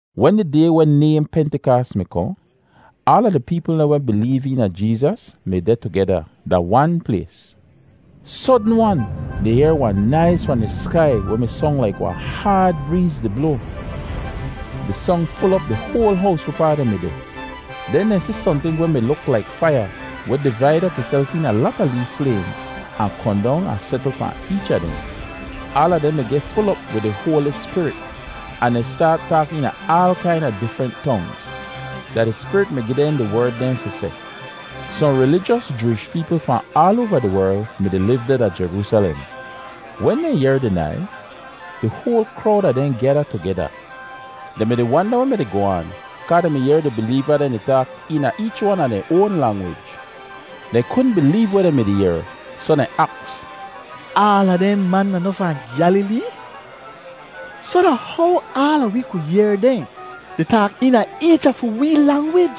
Wen di day weh nayhn Pentikaas mi kohn, aala di peepl dehn weh mi bileev eena Jeezas mi deh tugeda da wan plays. Sodn-wan, dehn yehr wahn naiz fahn di skai weh mi song laik wahn haad breez di bloa. Di song ful op di hoal hows wehpaa dehn mi deh. Den dehn si sohnting weh mi luk laik faiya weh divaid op ihself eena lata lee flaym ahn kohn dong ahn setl pahn eech a dehn. Aala dehn mi geh ful op wid di Hoali Spirit ahn dehn staat taak eena aal kaina difrent tongz. Da di Spirit mi gi dehn di werd dehn fi seh. Sohn rilijos Jooish peepl fahn aal oava di werl mi-di liv deh da Jeroosalem. Wen dehn yehr di naiz, di hoal krowd a dehn gyada tugeda. Dehn mi-di wanda weh mi-di goh aan kaa dehn mi yehr di bileeva dehn di taak eena eech wan a dehn oan langwij. Dehn kudn bileev weh dehn mi-di yehr, soh dehn aks, “Aala dehn man da noh fahn Gyalilee? Soh da how aala wi ku yehr dehn di taak eena eech a fi wee langwij?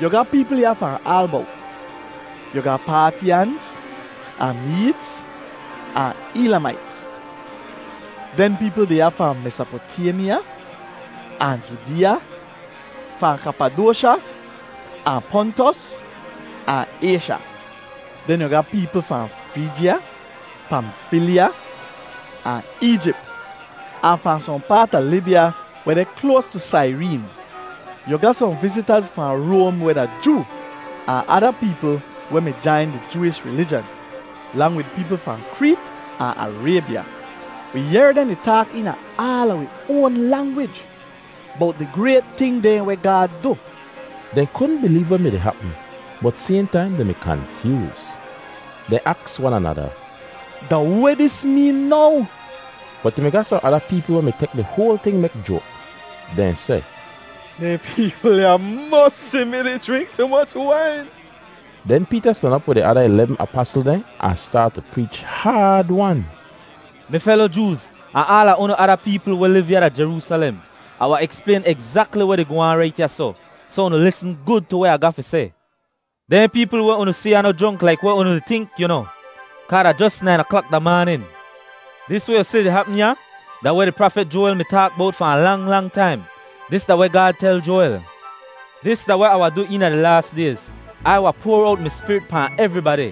Yu ga peepl ya fahn aal bowt. Yu ga Paatyanz, ahn Meedz, ahn Eelamaits. Den peepl deh ya fahn Mesopotaymya ahn Judeeya, fahn Kapadosha ahn Pontus, ahn Aysha. Den yu ga peepl fahn Frijya, Pamfilya, ahn Eejip ahn fahn sohn paat a Libya weh deh kloas tu Saireen. Yu ga sohn vizitaz fahn Roam weh da Joo ahn ada peepl weh mi jain di Jooish rilijan, lang wid peepl fahn Kreet ahn Araybya. Wi yehr dehn di taak eena aala wi oan langwij bowt di grayt ting dehn weh Gaad du.” Dehn kudn bileev weh mi-di hapm, bot sayhn taim dehn mi kanfyooz. Dehn aks wan anada, “Da weh dis meen now?” Bot yu mi ga sohn ada peepl weh mi tek di hoal ting mek joak. Dehn seh, “Dehn peepl ya mosi mi-di jrink tu moch wain!” Den Peeta stan op wid di ada ilebm apasl dehn ahn staat tu preech haad-wan. “Mi felo Jooz, ahn aala unu ada peepl weh liv ya da Jeroosalem, Ah wahn eksplayn egzakli weh di goh aan rait ya soh; soh unu lisn gud tu weh Ah ga fi seh. Dehn peepl weh unu si ya noh jronk laik weh unu di tink, yu noh; kaa da jos nain aklak da maanin. Dis weh yu si di hapm ya da weh di prafit Joawel mi taak bowt fahn lang lang taim. Dis da weh Gaad tel Joawel: ‘Dis da weh Ah wahn du eena di laas dayz: Ai wahn poar owt mi Spirit pahn evribadi.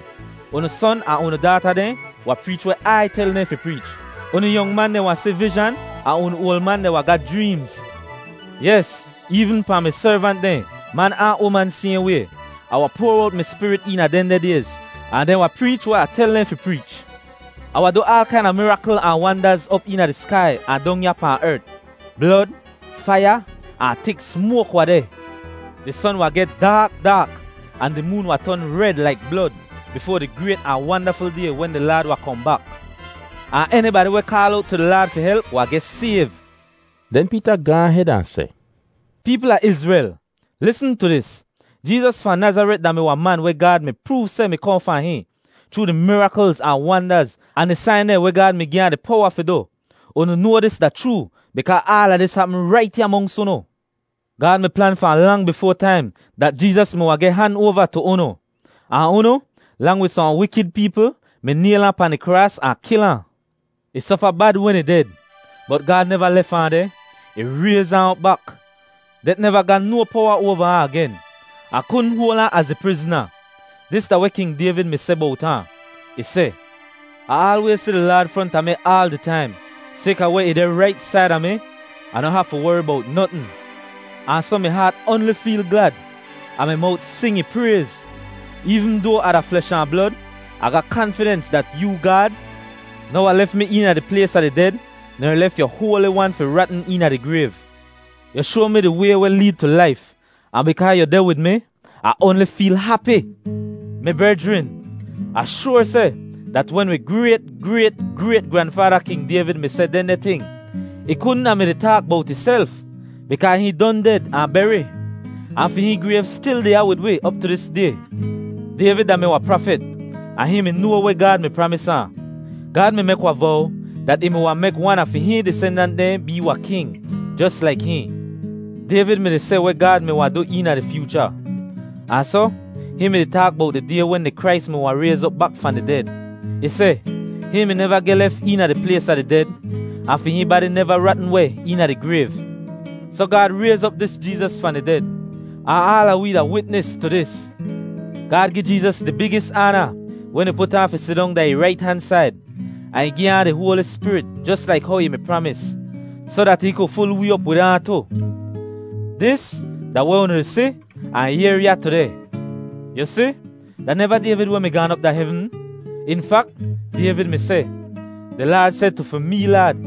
Unu son ahn unu daata dehn wahn preech weh Ai tel dehn fi preech. Unu yong man dehn wahn si vizhan, ahn unu oal man dehn wahn ga jreemz. Yes, eevn pahn mi servant dehn, man ahn uman sayhn way, Ah wahn poar owt mi Spirit eena dehndeh dayz. Ahn dehn wahn preech weh Ah tel dehn fi preech! Ah wahn du aal kaina mirakl ahn wandaz op eena di skai ahn dong ya pahn ert. Blod, faiya, ahn tik smoak wahn deh. Di son wahn geh daak daak, ahn di moon wahn ton red laik blod, bifoa di grayt ahn wandaful Day wen di Laad wahn kohn bak. Ahn enibadi weh kaal owt tu di Laad fi help wahn geh sayv.’” Den Peeta gaahn hed ahn seh, “Peepl a Izrel, lisn tu dis! Jeezas fahn Nazaret da-mi wahn man weh Gaad mi proov seh mi kohn fahn hihn, chroo di miraklz ahn wandaz ahn di sain dehn weh Gaad mi gi ahn di powa fi du. Unu noa dis da chroo, bikaa aala dis hapm rait ya monks unu. Gaad mi plan fahn lang bifoa taim dat Jeezas mi wahn geh han oava tu unu. Ahn unu, lang wid sohn wikid peepl, mi nayl ahn pahn di kraas ahn kil ahn. Ih sofa bad wen ih ded, bot Gaad neva lef ahn deh; ih rayz ahn op bak. Det neva ga no powa oava ahn agen, ahn kudn hoal ahn az ih prizna. Dis da weh King Dayvid mi seh bowt ahn: Ih seh, ‘Ah aalwayz si di Laad fronta mi aal di taim. Sayka weh ih deh rait saida mi, Ah noh hafu wori bowt notn. Ahn soh mi haat oanli feel glad, ahn mi mowt sing ih prayz. Eevn doa Ah da flesh ahn blod, Ah ga kanfidens dat yoo, Gaad, noh wahn lef mi eena di plays a di ded, ner lef yu Hoali Wan fi ratn eena di grayv. Yu shoa mi di way weh leed tu laif, ahn bikaa yu deh wid mi, Ah oanli feel hapi.’ “Mi brejrin, Ah shoar seh dat wen wi grayt-grayt-grayt-granfaada King Dayvid mi seh dehndeh ting, ih kudn a mi-di taak bowt ihself bikaa hihn don ded ahn beri, ahn fi hihn grayv stil deh ya wid wi op tu dis day. Dayvid da-mi wahn prafit, ahn hihn mi noa weh Gaad mi pramis ahn: Gaad mi mek wahn vow dat ih mi wahn mek wan a fi hihn disendant dehn bee wahn king, jos laik hihn. Dayvid mi-di si weh Gaad mi wahn du eena di fyoocha, ahn soh hihn mi-di taak bowt di day wen di Krais mi wahn rayz op bak fahn di ded. Ih seh, ‘Hihn mi neva geh lef eena di plays a di ded, ahn fi hihn badi neva ratn weh eena di grayv.’ Soh Gaad rayz op dis Jeezas fahn di ded, ahn aala wee da witnis tu dis. Gaad gi Jeezas di bigis aana wen ih put ahn fi sidong da ih rait han said; ahn ih gi ahn di Hoali Spirit jos laik how ih mi pramis, soh dat hihn ku ful wee op wid ahn tu. Dis da weh unu di si ahn yehr ya tudeh. Yu si, da neva Dayvid weh mi gaan op da hevn. In fak, Dayvid mi seh, ‘Di Laad seh tu fi mee Laad,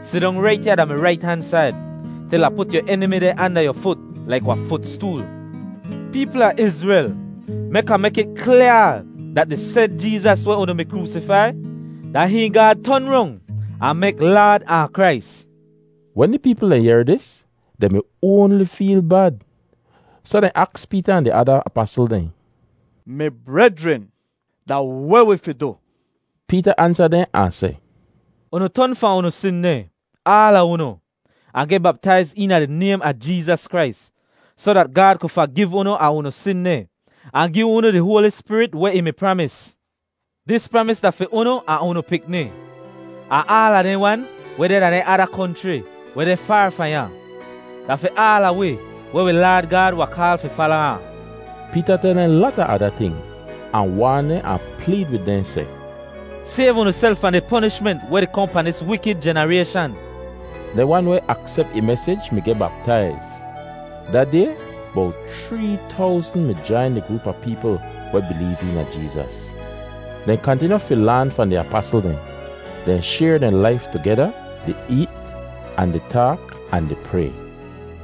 “Sidong rait ya da mi rait han said, til Ah put yu enimi dehn anda yu fut laik wahn futstool.”’ “Peepl a Izrel, mek Ah mek it klyaa dat di sed Jeezas weh unu mi kroosifai, da hihn Gaad ton rong ahn mek Laad ahn Krais.” Wen di peepl dehn yehr dis, dehn mi oanli feel bad. Soh dehn aks Peeta ahn di ada apasl dehn, “Mi brejrin, da weh wi fi du?” Peeta ansa dehn ahn seh, “Unu ton fahn unu sin dehn, aala unu, ahn geh baptaiz eena di naym a Jeezas Krais, soh dat Gaad ku fagiv unu a unu sin dehn, ahn gi unu di Hoali Spirit weh ih mi pramis. Dis pramis da fi unu ahn unu pikni, ahn aala dehn wan weh deh da dehn ada konchri weh deh faar fahn ya. Da fi aala wi weh wi Laad Gaad wahn kaal fi fala ahn.” Peeta tel dehn lata ada ting, ahn waan dehn ahn pleed wid dehn seh, “Sayv unuself fahn di ponishment weh di kohn pahn dis wikid jenarayshan.” Dehn wan weh aksep ih mesij mi geh baptaiz. Da day bowt chree towzn mi jain di groop a peepl weh bileev eena Jeezas. Dehn kantinyu fi laan fahn di apasl dehn. Dehn shayr dehn laif tugeda, di eet, ahn di taak, ahn di pray.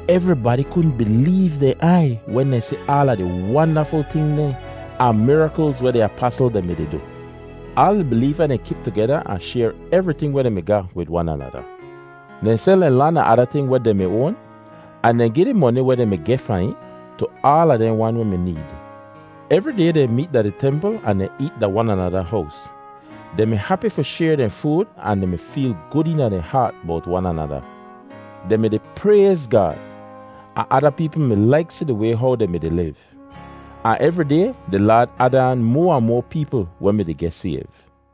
Evribadi kudn bileev dehn aiy wen dehn si aala di wandaful ting dehn ahn miraklz weh di apasl dehn mi-di du. Aal di bileeva dehn kip tugeda ahn shayr evriting weh dehn mi ga wid wan anada. Dehn sel dehn lan ahn ada ting dehn weh dehn mi oan, ahn dehn gi di moni weh dehn mi geh fahn it tu aala dehn wan weh mi need. Evri day dehn meet da di templ ahn dehn eet da wan anada hows. Dehn mi hapi fi shayr dehn food ahn dehn mi feel gud eena dehn haat bowt wan anada. Dehn mi-di prayz Gaad, ahn ada peepl mi laik si di way how dehn mi-di liv. Ahn evri day di Laad ad aan moa ahn moa peepl weh mi-di geh sayv.